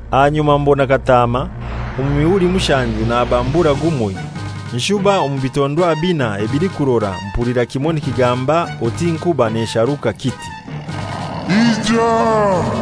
Ahanyuma mbona Kataama, omu mihuri mushanju nabamburura gumoi, nshuba omu bitondwa binai ebilikurora mpulira kimoi nikigamba oti nkuba nesharuka kiti, «Ija!»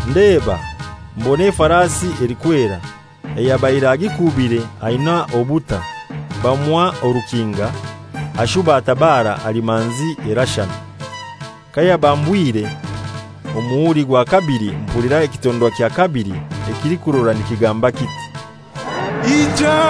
Ndeeba, mbona efarasi elikwera, ayabaire agikuubire aina obuta, bamuha orukinga, ashuba atabara ali manzi erashana. Kayabambwire omuhuri gwa kabili mpulira ekitondwa kya kabili ekilikurora nikigamba kiti, «Ija!»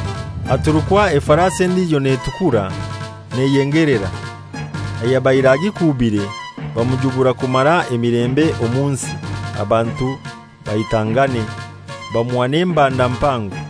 Aturukwa efarasi endijo netukura neyengelera. Ayabaire agikuubire bamujubura kumara emilembe omu nsi, abantu baitangane; bamuha n'embanda mpango.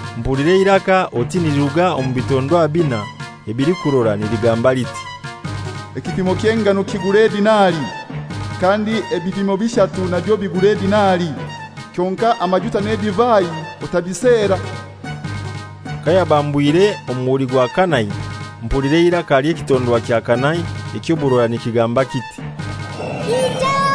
Mpulira eiraka oti niliruga omu bitondwa binai ebilikurora niligamba liti, «Ekipimo ky'engano kigure edinari, kandi ebipimo bishatu nabyo bigure edinari, kyonkai amajuta n'edivai otabisera!» Kayabambwire omuhuri gwa kanai, mpulira eiraka ly'ekitondwa kya kanai eky'oburora nikigamba kiti, «Ija!»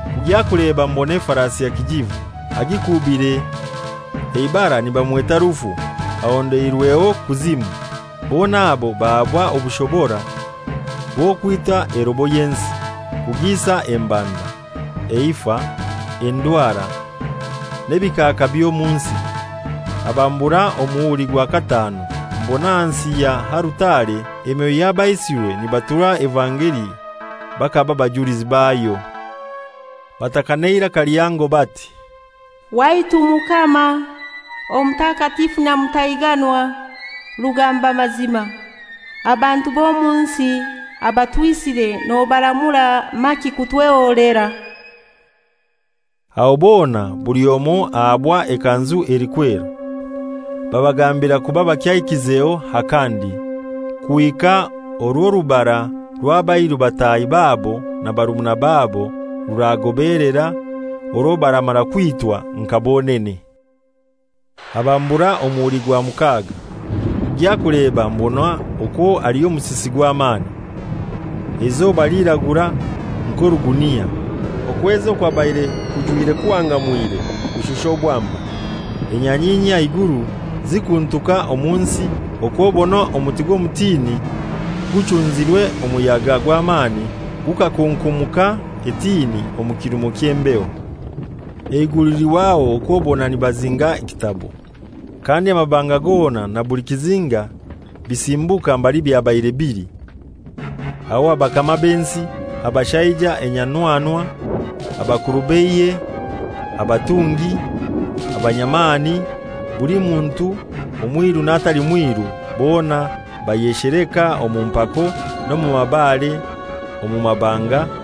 Kugya kuleba mbona efarasi ekilikurora, agikuubire eibara nibamweta «Rufu,» ahondeirweho «Kuzimu,» bona abo bahaabwa obushobora bw'okwita erobo y'ensi, kugiisa embanda, eifa, endwara n'ebikaaka by'omu nsi. Abambura omuhuri gwa kataanu, mbona ahansi ya alutare emyoyo y'abaisirwe nibaturwa evangeli bakaba bajulizi bayo. Bataka n'eiraka lihango bati, «Waitu Mukama Omutakatifu nyamutaiganwa rugamba mazima, abantu b'omu nsi abatwisire nobaramura maki kutweholera?» Aho bona buli omoi ahabwa ekanzu elikwera, babagambira kuba bakyaikizeho akandi, kuhika orw'orubara rw'abairu bataahi babo na barumuna babo ruragobelera, orwo baramara kwitwa nka bonene. Abambura omuhuri gwa mukaaga, kugya kuleba mbona okwo aliho omusisi gw'amani. Eizoba liiragura nk'orugunia, okwezi okwabaire kujwire kuhangamwire kushusha obwamba, enyanyinyi aha iguru zikuntuka omu nsi okw'obona omuti gw'omutini guchunzirwe omuyaga gw'amani gukakunkumuka etini omu kirumo ky'embeho. Eiguru lihwaho okw'obona nibazinga ekitabo, kandi amabanga gona na buli kizinga bisimbuka mbali byabaire bili. Aho abakama b'ensi, abashaija enyanwanwa, abakuru b'eihe, abatungi, abanyamani, buli muntu, omwiru n'atali mwiru, bona bayesheleka omu mpako, n'omu mabare omu mabanga,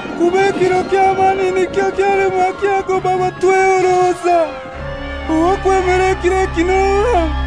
kuba ekiro ky'amani nikyo kyalemwa kyagoba batwehoroza; ow'okwemera ekiro ekyo n'ohai?»